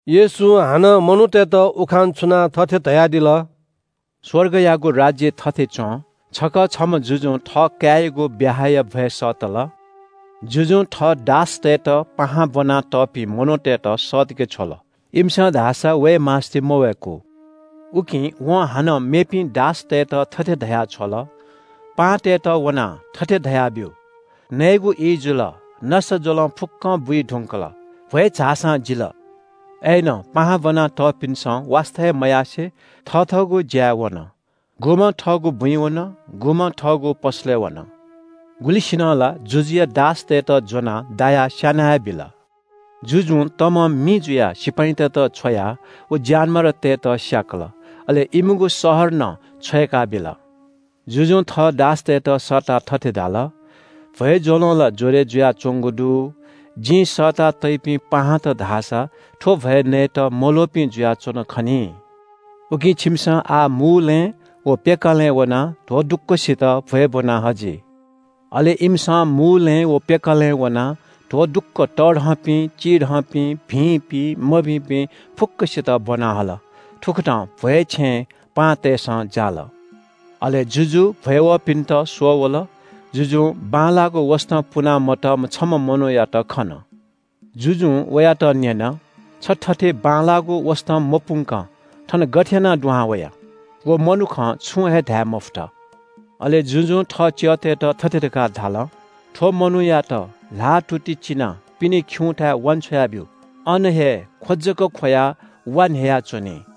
येशूं हानं मनूतय्‌त उखान छुनाः थथे धयादिल। “स्‍वर्गयागु राज्‍य थथे च्‍वं – छकः छम्‍ह जुजुं थः काय्‌यागु ब्‍याहाया भ्‍वय् सःतल। जुजुं थः दासतय्‌त पाहां ब्‍वना तःपिं मनूतय्‌त सःतके छ्वल। इमिसं धाःसा वये मास्‍ति मवय्‌कू। “उकिं वं हानं मेपिं दासतय्‌त थथे धया छ्वल – ‘पाहांतय्‌त वनाः थथे धयाब्‍यु। नयेगु ई जुल। नसाज्‍वलं फुक्‍कं बुइ धुंकल। भ्‍वय् झाःसां जिल।’ अय्‌नं पाहां ब्‍वना तःपिन्‍सं वास्‍ता हे मयासें थथःगु ज्‍याय् वन। गुम्‍हं थःगु बुँइ वन, गुम्‍हं थःगु पसलय् वन। गुलिसिनं ला जुजुया दासतय्‌त ज्‍वनाः दायाः स्‍याना हे बिल। “जुजुं तमं मि जुयाः सिपाइँतय्‌त छ्वयाः व ज्‍यानमारातय्‌त स्‍याकल। अले इमिगु शहर नं छ्वय्‌काबिल। जुजुं थः दासतय्‌त सःताः थथे धाल – ‘भ्‍वय् ज्‍वलं ला ज्‍वरय् जुयाच्‍वंगु दु। जिं सःता तइपिं पाहांत धाःसा थ्‍व भ्‍वय् नयेत मल्‍वःपिं जुयाच्‍वन खनी। उकिं छिमिसं आः मूलँय् व पेकालँय् वनाः ध्‍वदुक्‍वसित भ्‍वय् ब्‍वना हजि।’ अले इमिसं मूलँय् व पेकालँय् वनाः ध्‍वदुक्‍व तःधंपिं, चिधंपिं, भिंपिं, मभिंपिं फुक्‍कसित ब्‍वना हल। थुकथं भ्‍वय् छेँ पाहांतय्‌सं जाल।” “अले जुजु भ्‍वय् वःपिन्‍त स्‍वः वल। जुजुं बांलाःगु वसतं पुना मतःम्‍ह छम्‍ह मनूयात खन। जुजुं वयात न्‍यन – ‘छ थथे बांलाःगु वसतं मपुंकं थन गथे यानाः दुहां वया?’ व मनुखं छुं हे धाये मफुत। अले जुजुं थः च्‍यःतय्‌त थथे धकाः धाल – ‘थ्‍व मनूयात ल्‍हाःतुति चिनाः पिने खिउँथाय् वान्‍छ्वया ब्‍यु। अन हे ख्‍व जक ख्‍वयाः वा न्‍ह्ययाच्‍वनी।’”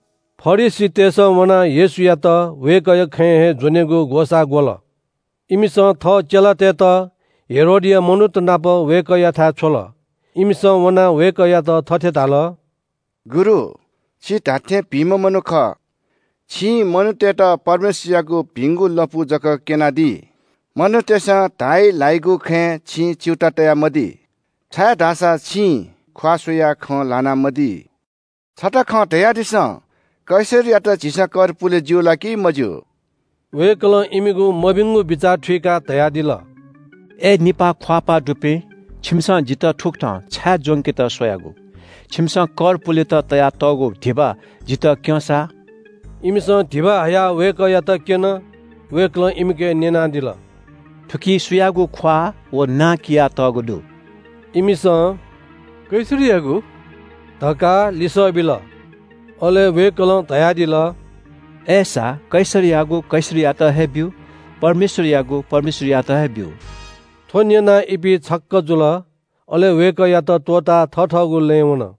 फरिसीतय्‌सं वनाः येशूयात वय्‌कःया खँय् हे ज्‍वनेगु ग्‍वसाः ग्‍वल। इमिसं थः चेलातय्‌त हेरोदया मनूत नाप वय्‌कःयाथाय् छ्वल। इमिसं वनाः वय्‌कःयात थथे धाल – “गुरु, छि धात्‍थें भिंम्‍ह मनू खः। छिं मनूतय्‌त परमेश्‍वरयागु भिंगु लँपु जक क्‍यनादी। मनूतय्‌सं धाइ ल्‍हाइगु खँय् छिं च्‍यूताः तयामदी, छाय्‌धाःसा छिं ख्‍वाः स्‍वयाः खँ ल्‍हानामदी। छता खँ धयादिसँ, कैसरयात झीसं कर पुले ज्‍यू ला कि मज्‍यू?” वय्‌कलं इमिगु मभिंगु बिचाः थुइकाः धयादिल – “अय् निपाः ख्‍वाःपाः दुपिं, छिमिसं जितः थुकथं छाय् ज्‍वंकेत स्‍वयागु? छिमिसं कर पुलेत तयातःगु धिबा जितः क्‍यँ सा।” इमिसं धिबा हयाः वय्‌कःयात क्‍यन। वय्‌कलं इमिके न्‍यनादिल – “थुकी सुयागु ख्‍वाः व नां कियातःगु दु?” इमिसं “कैसरयागु” धकाः लिसः बिल। अले वय्‌कलं धयादिल – “अय्‌सा कैसरयागु कैसरयात हे ब्‍यु, परमेश्‍वरयागु परमेश्‍वरयात हे ब्‍यु।” थ्‍व न्‍यनाः इपिं छक्‍क जुल। अले वय्‌कःयात त्‍वःताः थथःगु लँय् वन।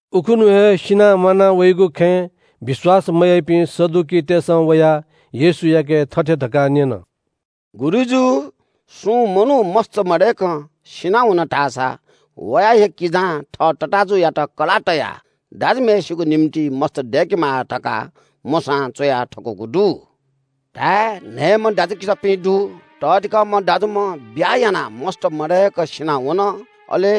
उखुन्‍हु हे सिनाः म्‍वाना वइगु खँय् विश्‍वास मयाइपिं सदुकीतय्‌सं वयाः येशूयाके थथे धकाः न्‍यन – “गुरुजु, सुं मनू मस्‍त मदय्‌कं सिनावन धाःसा वया हे किजां थः तताःजुयात कलाः तयाः दाजुम्‍हय्‌सिगु निंतिं मस्‍त दय्‌केमाः धकाः मोशां च्‍वया थकूगु दु। धाय्, न्‍हय्‌म्‍ह दाजुकिजापिं दु। तःधिकःम्‍ह दाजुम्‍ह ब्‍याहा यानाः मस्‍त मदय्‌क सिनावन। अले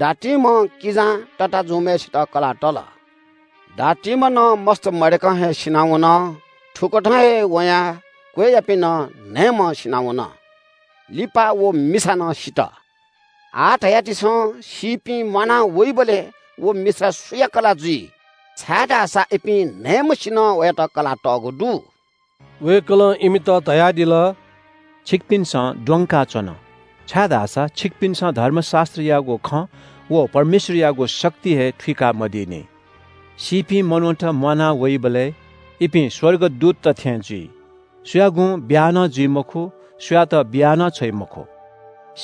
दातिम्‍ह किजां तताःजुम्‍हय्‌सित कलाः तल। दातिम्‍ह नं मस्‍त मदय्‌क हे सिनावन। थुकथं हे वयां क्‍वय्‌यापिं नं न्‍हय्‌म्‍हं सिनावन। लिपा व मिसा नं सित। आः धयादिसँ, सीपिं म्‍वाना वइबलय् व मिसा सुया कलाः जुइ? छाय्‌धाःसा इपिं न्‍हय्‌म्‍हय्‌सिनं वयात कलाः तःगु दु।” वय्‌कलं इमित धयादिल – “छिकपिन्‍सं द्वंकाच्‍वन, छाय्‌धाःसा छिकपिन्‍सं धर्मशास्‍त्रयागु खँ व परमेश्‍वरयागु शक्ति हे थुइकामदीनि। सीपिं मनूत म्‍वाना वइबलय् इपिं स्‍वर्गदूतत थें जुइ। सुयागुं ब्‍याहा नं जुइ मखु, सुयातं बिया नं छ्वइ मखु।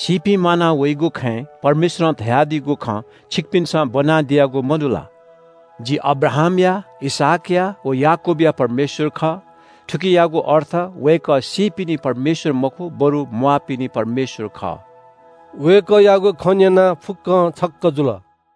“सीपिं म्‍वाना वइगु खँय् परमेश्‍वरं धयादीगु खँ छिकपिन्‍सं ब्‍वनादियागु मदु ला? ‘जि अब्राहामया, इसहाकया व याकूबया परमेश्‍वर खः।’ थुकियागु अर्थ वय्‌कः सीपिनि परमेश्‍वर मखु, बरु म्‍वाःपिनि परमेश्‍वर खः।” वय्‌कःयागु खँ न्‍यनाः फुक्‍कं छक्‍क जुल।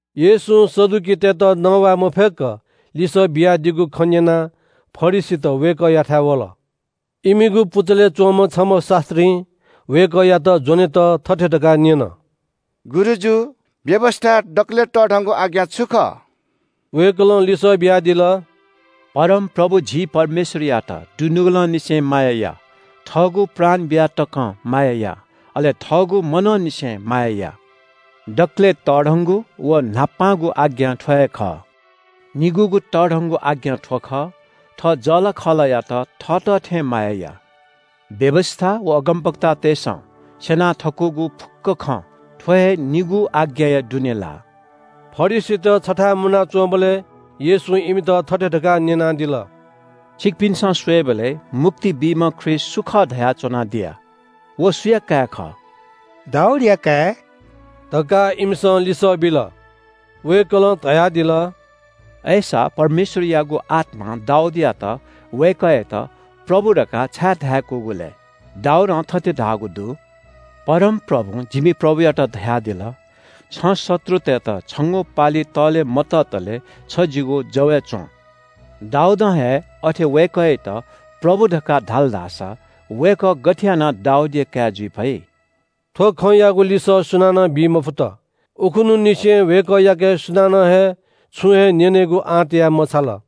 येशूं सदुकीतय्‌त नवाये मफय्‌क लिसः बियादीगु खँ न्‍यनाः फरिसीत वय्‌कःयाथाय् वल। इमिगु पुचलय् च्‍वंम्‍ह छम्‍ह शास्‍त्रीं वय्‌कःयात ज्‍वनेत थथे धकाः न्‍यन – “गुरुजु, व्‍यवस्‍थाय् दकलय् तःधंगु आज्ञा छु खः?” वय्‌कलं लिसः बियादिल – “परमप्रभु झी परमेश्‍वरयात दुनुगलंनिसें माया या, थःगु प्राण बियाः तकं माया या, अले थःगु मनंनिसें माया या। दकलय् तःधंगु व न्‍हापांगु आज्ञा थ्‍व हे खः। निगूगु तःधंगु आज्ञा थ्‍व खः – थः जःलाखःलायात थःत थें माया या। व्‍यवस्‍था व अगमवक्तातय्‌सं स्‍यना थकूगु फुक्‍क खँ थ्‍व हे निगू आज्ञाया दुने लाः।” फरिसीत छथाय् मुनाच्‍वंबलय् येशूं इमित थथे धकाः न्‍यनादिल – “छिकपिन्‍सं स्‍वयेबलय् – मुक्ति बीम्‍ह ख्रीष्‍ट सु खः धयाच्‍वनादिया? व सुया काय् खः?” “दाऊदया काय्” धकाः इमिसं लिसः बिल। वय्‌कलं धयादिल – “अय्‌सा परमेश्‍वरयागु आत्‍मां दाऊदयात वय्‌कःयात ‘प्रभु’ धकाः छाय् धाय्‌कूगु लय्? दाऊदं थथे धाःगु दु – “‘परमप्रभुं जिमि प्रभुयात धयादिल, “छं शत्रुतय्‌त छंगु पालि तःले मततले छ जिगु जवय् च्‍वँ।”’ “दाऊदं हे अथे वय्‌कःयात ‘प्रभु’ धकाः धाल धाःसा वय्‌कः गथे यानाः दाऊदया काय् जुइ फइ?” थ्‍व खँयागु लिसः सुनानं बी मफुत। उखुन्‍हुंनिसें वय्‌कःयाके सुनानं हे छुं हे न्‍यनेगु आँट याये मछाल।